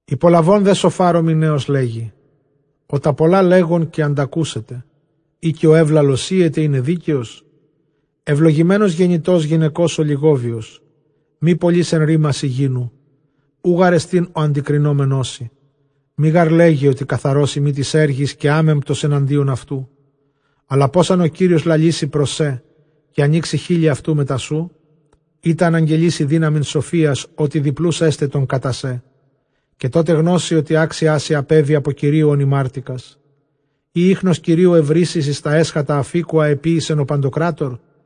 Ὑπολαβὼν δὲ Σωφὰρ ὁ Μιναῖος, λέγει, Ὁ τὰ πολλὰ λέγων, καὶ ἀντακούσεται· ἢ καὶ ὁ εὔλαλος οἴεται εἶναι δίκαιος; εὐλογημένος γεννητὸς γυναικὸς ὀλιγόβιος. Μὴ πολὺς ἐν ῥήμασι γίνου, οὐ γάρ ἐστιν ὁ ἀντικρινόμενός σοι; Μὴ γὰρ λέγε, ὅτι καθαρός εἰμι τοῖς ἔργοις καὶ ἄμεμπτος ἐναντίον αὐτοῦ. Ἀλλὰ πῶς ἂν ὁ Κύριος λαλήσαι πρὸς σὲ, καὶ ἀνοίξει χείλη αὐτοῦ μετὰ σοῦ; Εἶτα ἀναγγελεῖ σοι δύναμιν σοφίας· ὅτι διπλοῦς ἔσται τῶν κατὰ σέ· καὶ τότε γνώσῃ, ὅτι ἄξιά σοι ἀπέβη ἀπὸ Κυρίου ὧν ἡμάρτηκας. Ἢ ἴχνος Κυρίου εὑρήσεις, ἢ εἰς τὰ ἔσχατα ἀφίκου ἃ ἐποίησεν ὁ παντοκράτωρ;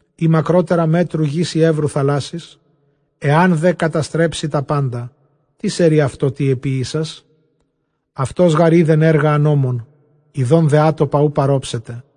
ἢ μακρότερα μέτρου γῆς, ἢ εὔρους θαλάσσης; Ἐὰν δὲ καταστρέψῃ τὰ πάντα, τίς ἐρεῖ αὐτῷ, τί ἐποίησας; Αὐτὸς γὰρ οἶδεν ἔργα ἀνόμων, ἰδὼν δὲ ἄτοπα οὐ παρόψεται.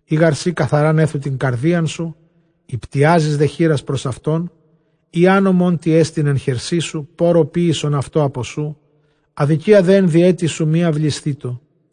Εἰ γὰρ σὺ καθαρὰν ἔθου τὴν καρδίαν σου, ὑπτιάζεις δὲ χεῖρας πρὸς αὐτὸν, εἰ ἄνομόν τί ἐστιν ἐν χερσί σου, πόῤῥω ποίησον αὐτὸ ἀπὸ σοῦ, ἀδικία δὲ ἐν διαίτῃ σου μὴ αὐλισθήτω·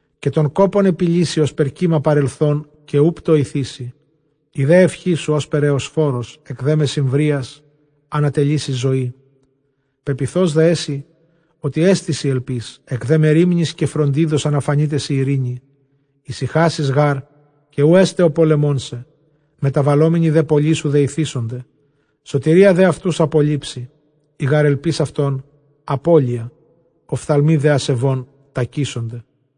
Καὶ τὸν κόπον ἐπιλήσῃ, ὥσπερ κῦμα παρελθὸν, καὶ οὐ πτοηθήσῃ· Ἡ δὲ εὐχή σου ὥσπερ Ἑωσφόρος, ἐκ δὲ μεσημβρίας ἀνατελεῖ σοι ζωή· Πεποιθώς τε ἔσῃ, ὅτι ἐστί σοι ἐλπὶς, ἐκ δὲ μερίμνης καὶ φροντίδος ἀναφανεῖταί σοι εἰρήνη· Ἡσυχάσεις γὰρ, καὶ οὐκ ἔσται ὁ πολεμῶν σε· μεταβαλόμενοι δὲ πολλοί σου δεηθήσονται. Σωτηρία δὲ αὐτοὺς ἀπολείψει· ἡ γὰρ ἐλπὶς αὐτῶν ἀπώλεια, ὀφθαλμοὶ δὲ ἀσεβῶν τακήσονται.